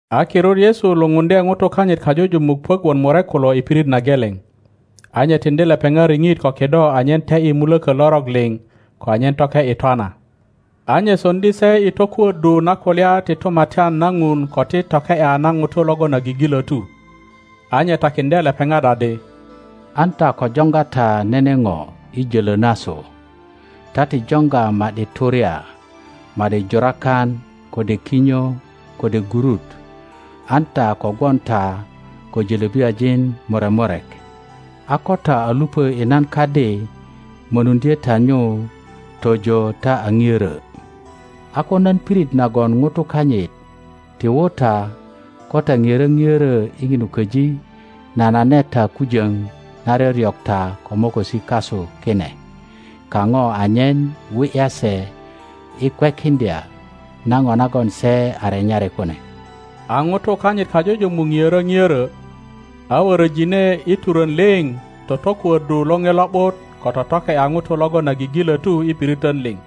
A kirut Yesu lupundye ŋutukanyit kajujumuk puök wot murek kulo i pirit na geleŋ, a nye tiŋdi lepeŋat riŋit ko kido anyen te ’yi mulökö lorok liŋ ko anyen toke ’yi twana, a nye soŋdi se i tokuöddu na kulya ti Tumatyan na Ŋun ko i toke ’ya na ŋutu logon a gigilötu. A nye takiŋdye lepeŋat adi, An ta ko joŋga ta nene ŋo i jölö nasu; ta ti joŋga ma ’di turya, ma ’di jurakan, kode kinyo, kode gurut; an ta ko gwon ta ko jölöbiyajin murek murek. a ko ta a lupö i nan kadi mönuŋdye ta nyu tojo ta a ŋiörö. A ko nan pirit nagon ŋutu kanyit ti wu ta, ko ta ŋiörö ŋiörö i ŋinu köji, nanane ta kujöŋ na ryoryok ta ko mokosi kasu kine kaŋo anyen wi ’ya se i kwekiŋdya na ŋo nagon se a renyari kune. A ŋutu kanyit kajujumuk ŋiörö ŋiörö, a wöröjine i turön liŋ totokuöddu Loŋe Lo ’but ko totoke ’ya ŋutu logon a gigilötu i piritön liŋ.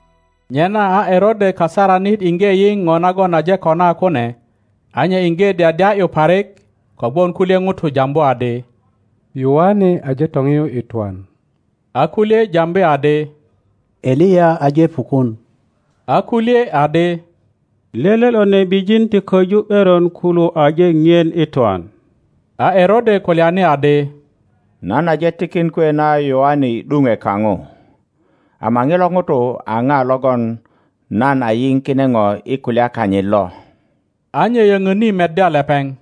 Nyena a Erode kasaranit iŋge yiŋ ŋo nagon aje kona kune, a nye iŋge dyadya ’yu parik, kogwon kulye ŋutu jambu adi, Yoane aje toŋiyu i twan, a kulye jambi adi, Eliya aje pukun, a kulye adi, lele lo nebijin ti köju ’beron kulu aje ŋien i twan. A Erode kulyani adi, Nan aje tikin kwe na Yoane i ’duŋwe kaŋo; ama ŋilo ŋuto a ŋa logon nan a yiŋ kine ŋo i kulya kanyit lo? A nye yöŋöni meddya lepeŋ.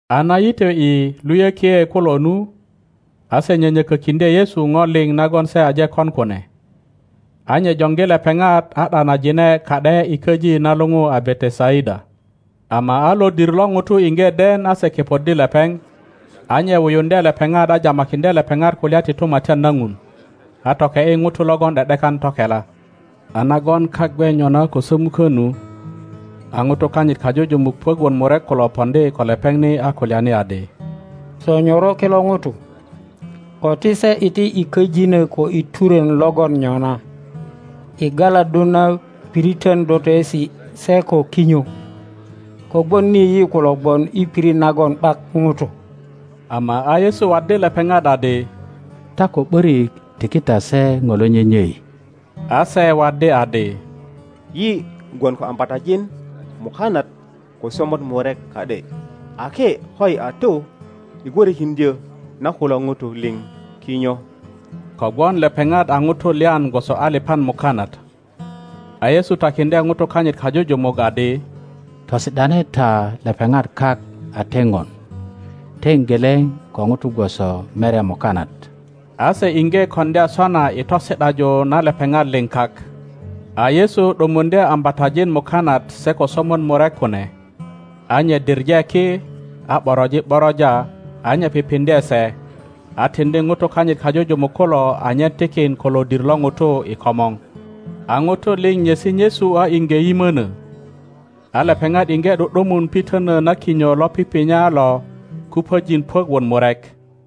A na yitwe ’i luyökie kulo nu, a se nyönyökökiŋdye Yesu ŋo liŋ nagon se aje kon kune. A nye joŋgi lepeŋat a ’danajine ka ’de i köji na luŋu a Betesaida. Ama a lodir lo ŋutu iŋge den a se kepoddi lepeŋ; a nye wuyuŋdye lepeŋat a jamakiŋdye lepeŋat kulya ti Tumatyan na Ŋun, a toke ’yi ŋutu logon ’de ’dekan tokela. A nagon kak gwe nyona ko sömukö nu, a ŋutu kanyit kajujumuk puök wot murek kulo poŋdi ko lepeŋ ni a kulyani adi, Sonyoro kilo ŋutu, ko ti se iti i köjinö ko i turön logon nyona, i galaddu na piritön dotoesi se ko kinyo; kogwon ni yi kulo gwon i pirit nagon ’bak ŋutu. Ama a Yesu waddi lepeŋat adi, Ta ko ’börik tiki ta se ŋo lo nyenyei. A se waddi adi, Yi gwon ko ambatajin mukanat ko somot murek ka ’de ake koyi a tu i gwörökiŋdyö na kulo ŋutu liŋ kinyo. Kogwon lepeŋat a ŋutu lyan gwoso aliŋan mukanat. A Yesu takiŋdye ŋutu kanyit kajujumuk adi, Tosi ’dane ta lepeŋat kak a teŋon, teŋ geleŋ ko ŋutu gwoso merya mukanat. A se iŋge koŋdya sona i tosi ’daju na lepeŋat liŋ kak. A Yesu ’dumuŋdye ambatajin mukanat se ko somot murek kune, a nye diŋe ki, a ’boroji ’boroja, a nye pipiŋdye se, a tiŋdi ŋutu kanyit kajujumuk kulo anyen tikin ko lodir lo ŋutu i komor. A ŋutu liŋ nyesi nyesu a iŋge yimönö. A lepeŋat iŋge ’du ’dumun pitönö na kinyo lo pipinya lo kupöjin puök wot murek.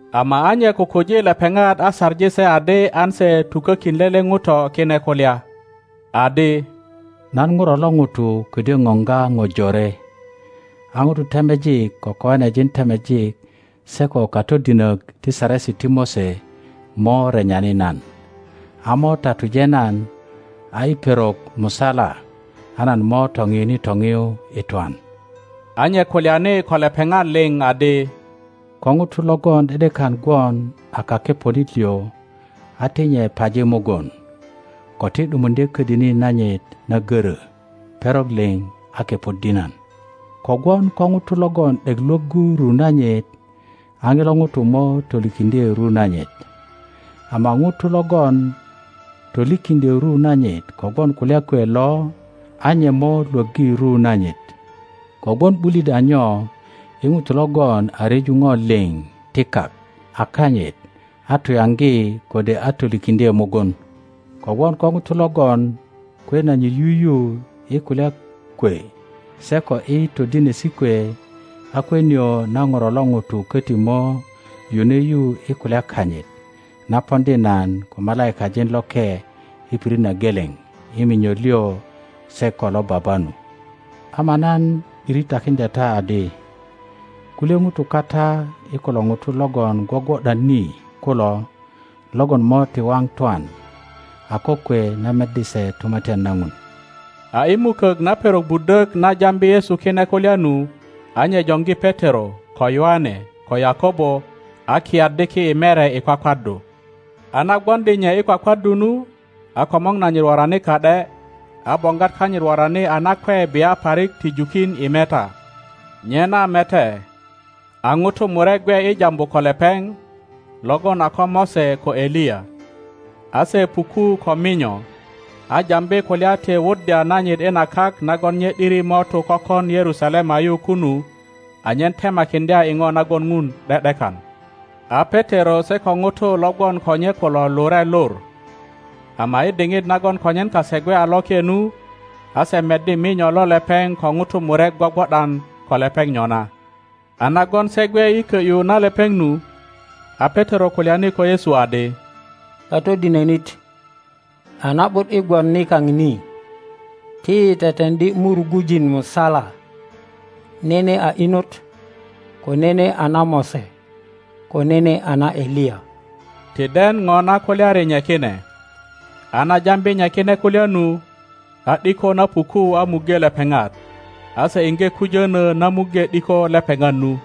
Ama a nye kukuji lepeŋat a saŋi se adi an se tukökin lele ŋuto kine kulya, adi, Nan ŋuro lo ŋuto ködyö ŋoŋga ŋo jore, a ŋutu temejik ko koanejin temejik se ko katodinök ti Saresi ti Mose mo renyani nan, a mo tatuje nan, a i perok musala a nan mo toŋiyuni toŋiyu i twan. A nye kulyani ko lepeŋat liŋ adi, Ko ŋuto logon ’de ’dekan gwon a kakeponit liŋ a ti nye paji mugun, ko ti ’dumuŋdye ködini nanyit na goro perok liŋ a kepoddi nan. Kogwon ko ŋuto logon ’dek Iwoggu ru nanyit a ŋilo ŋuto mo tolikiŋdye ru nanyit, ama ŋuto logon tolikiŋdyö ru nanyit kogwon kulya kwe lo a nye mo lwöggi ru nanyit. Kogwon ’bulit a nyo i ŋuto logon a ryeju ŋo liŋ ti kak a kanyit a tuyaŋgi kode a tolikiŋdye mugun? Kogwon ko ŋuto logon kwe nanyit yuyu i kulya kwe se ko i todinesi kwe, a kwe nio na Ŋuro lo ŋuto köti mo yune yu i kulya kanyit, na poŋdi nan ko malaikajin loke i pirit na geleŋ i minyo liŋ se ko lo Baba nu. Ama nan ’diri takiŋdya ta adi, Kulye ŋutu kata i kulo ŋutu logon gwogwo ’dan ni kulo logon mo ti waŋ twan a kokwe na meddi se tumatyan na Ŋun. A i mukök na perok budök na jambi Yesu kine kulya nu, a nye joŋgi Petero, ko Yoane, ko Yakobo, a kiyaddi ki i mere i kwakwaddu. a na gwoŋdi nye i kwakwaddu nu, a komor nanyit worani ka ’de, a boŋgwat kanyit worani a nakwe bia parik ti jukin i meta. Nyena mete, a ŋutu murek gwe i jambu ko lepeŋ, logon a ko Mose ko Eliya, a se puku ko minyo, a jambi kulya ti wuddya nanyit i na kak nagon nye ’diri mo tu kökon Yerusalema yu kunu anyen temakiŋdya i ŋo nagon Ŋun ’de ’dekan. A Petero se ko ŋutu lo gwon ko nye kulo lure lur, ama i diŋit nagon konyen kase gwe a loke nu, a se meddi minyo lo lepeŋ ko ŋutu murek gwogwo ’dan ko lepeŋ nyona. A nagon se gwe i kö ’yu na lepeŋ nu, a Petero kulyani ko Yesu adi, Katodinönit, a na ’but i gwon nikaŋ ni; ti yi teteŋdi murugujin musala, nene a inot, ko nene a na Mose, ko nene a na Eliya—ti den ŋo na kulyani nye kine. A na jambi nye kine kulya nu, a ’diko na puku a muŋge lepeŋat; a se iŋge kujönö na muŋge ’diko lepeŋat nu.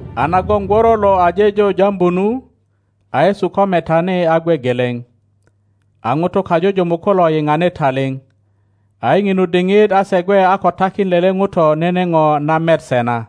a nagon gworo lo aje jo jambu nu, a Yesu ko metani a gwe geleŋ. A ŋutu kajujumuk kulo yiŋani taliŋ, a i ŋinu diŋit a se gwe a ko takin lele ŋuto nene ŋo na met se na.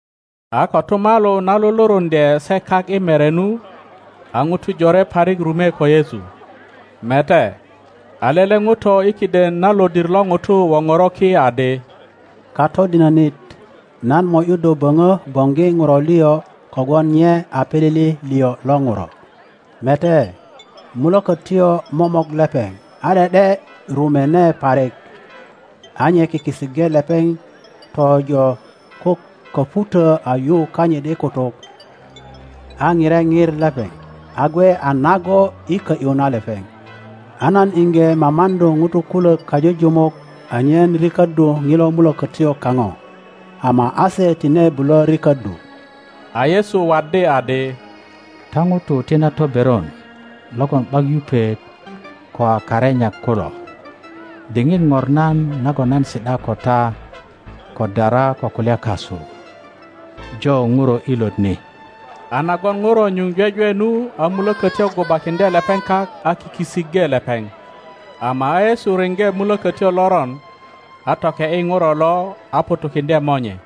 A kotumalu na luluruŋdye se kak i mere nu, a ŋutu jore parik rume ko Yesu. Mete, a lele ŋuto i kiden na lodir lo ŋutu woŋoro ki adi, Katodinönit, nan mo ’yu do böŋö boŋgi ŋuro liŋ kogwon nye a pilili liŋ lo ŋuro; mete, mulökötyo momok lepeŋ, a ’de ’de rumöne parik; a nye kiki iŋge lepeŋ tojo ko köŋutö a yu kanyit i kutuk, a pire pir lepeŋ, a gwe a nago i kö ’yu na lepeŋ. a nan iŋge mamaŋdu ŋutu kulök kajujumuk anyen riköddu ŋilo mulökötyo kaŋo, ama a se tine bulö riköddu. a Yesu waddi adi, Ta ŋutu ti na toberon logon ’bak yupet ko a karenyak kulo, diŋit ŋornan nagon nan si ’da ko ta ko dara ko kulya kasu? Jo ŋuro ilot ni. a nagon ŋuro nyuŋ jwejwe nu a mulökötyo gubakiŋöe lepeŋ kak a kiki iŋge lepeŋ. Ama a Yesu riŋge mulökötyo loron, a toke ’yi ŋuro lo, a ŋutukiŋdye monye.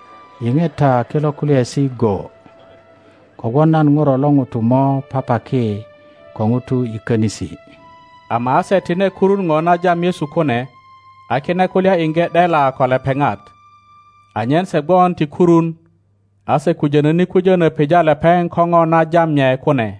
Yiŋe ta kilo kulyaesi go; kogwon nan Ŋuro lo ŋuto mo papaki ko ŋutu i könisi. Ama a se tine kurun ŋo na jam Yesu kune, a kine kulya iŋge ’dela ko lepeŋat, anyen se gwon ti kurun; a se kujönöni kujönö pija lepeŋ ko ŋo na jam nye kune.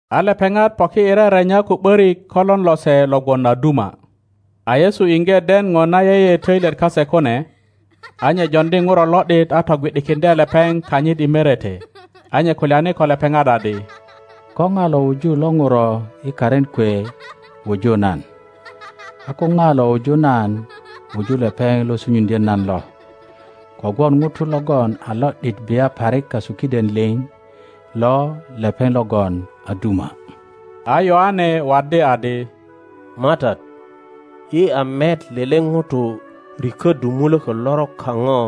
A lepeŋat poki i rerenya ko ’borik ko lon lose lo gwon a duma. A Yesu inge den no na yeye toilyet kase kune, a nye joŋdi ŋuro lo ’dit a togwi ’dikiŋdye lepeŋ kanyit i merete, a nye kulyani ko lepeŋat adi, Ko na lo wuju lo nuro i karin kwe wuju nan, a ko na lo wuju nan wuju lepeŋ lo sunyuŋdyo nan lo; kogwon ŋuto logon a lo ’dit bia parik kasu kiden liŋ lo lepeŋ logon a duma. A Yoane waddi adi, MATAT, yi a met lele ŋuto rikoddu muloko lorok kano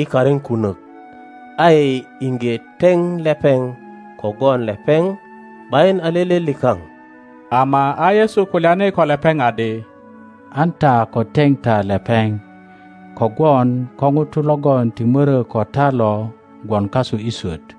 i karin kunök a yi inge teŋ lepeŋ, kogwon lepeŋ ’bayin a lele likaŋ. Ama a Yesu kulyani ko lepeŋ adi, An ta ko teŋ ta lepeŋ kogwon ko ŋuto logon ti mörö ko ta lo gwon kasu i swöt.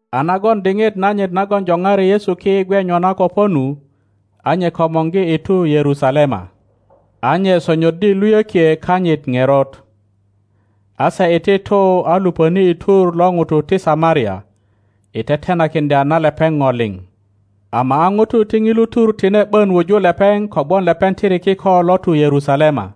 A nagon diŋit nanyit nagon joŋari Yesu ki gwe nyona ko po nu, a nye komorgi i tu Yerusalema, a nye sonyoddi luyökie kanyit ŋerot. A se iti tu a lupöni i tur lo nutu ti Samaria, i tetenakiŋdya na lepeŋ no liŋ; ama a nutu ti nilu tur tine ’bön wuju lepeŋ kogwon lepeŋ tiri kiko lo tu Yerusalema.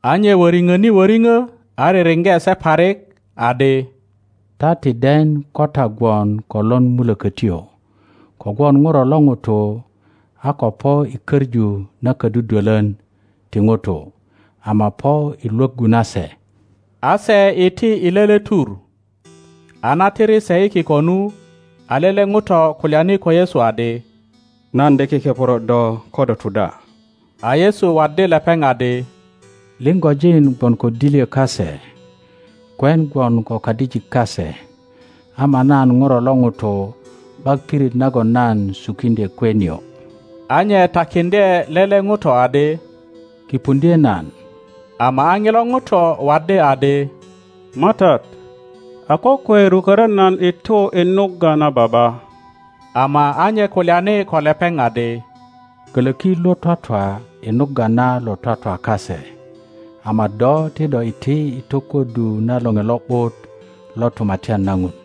A nye woriŋoni woriŋo a ririŋge se parik, [adi, Ta ti den ko ta gwon ko lon mulökötyo, kogwon Ŋuro lo ŋuto a ko po i köŋu na ködudwolor ti nutu, ama po i lwöggu na se.] A se iti i lele tur. A na tiri se i kiko nu, a lele ŋuto kulyani ko Yesu adi, Nan de kekeporo do ko do tu da. A Yesu waddi lepeŋ adi, Liŋgojin gwon ko dilyo kase, kwen gwon ko kadijik kase, ama nan Ŋuro lo ŋuto ’bak pirit nagon nan sukiŋdye kwe nio. a nye takiŋdye lele ŋuto adi, Kipuŋdye nan, ama a nilo ŋuto waddi adi, MATAT, a kokwe rukoro nan i tu i nugga na baba. Ama a nye kulyani ko lepeŋ adi, Koloki lo twatwa i nugga na lo twatwa kase, ama do ti do iti i tokuddu na Loŋe Lo ’but lo Tumatyan na Ŋun.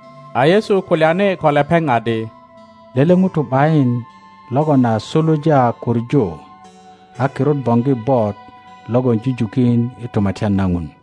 a Yesu kulyani ko lepeŋ adi, Lele ŋuto ’bayin logon a suluja kuŋu a kirut boŋgi bot logon jujukin i Tumatyan na Ŋun.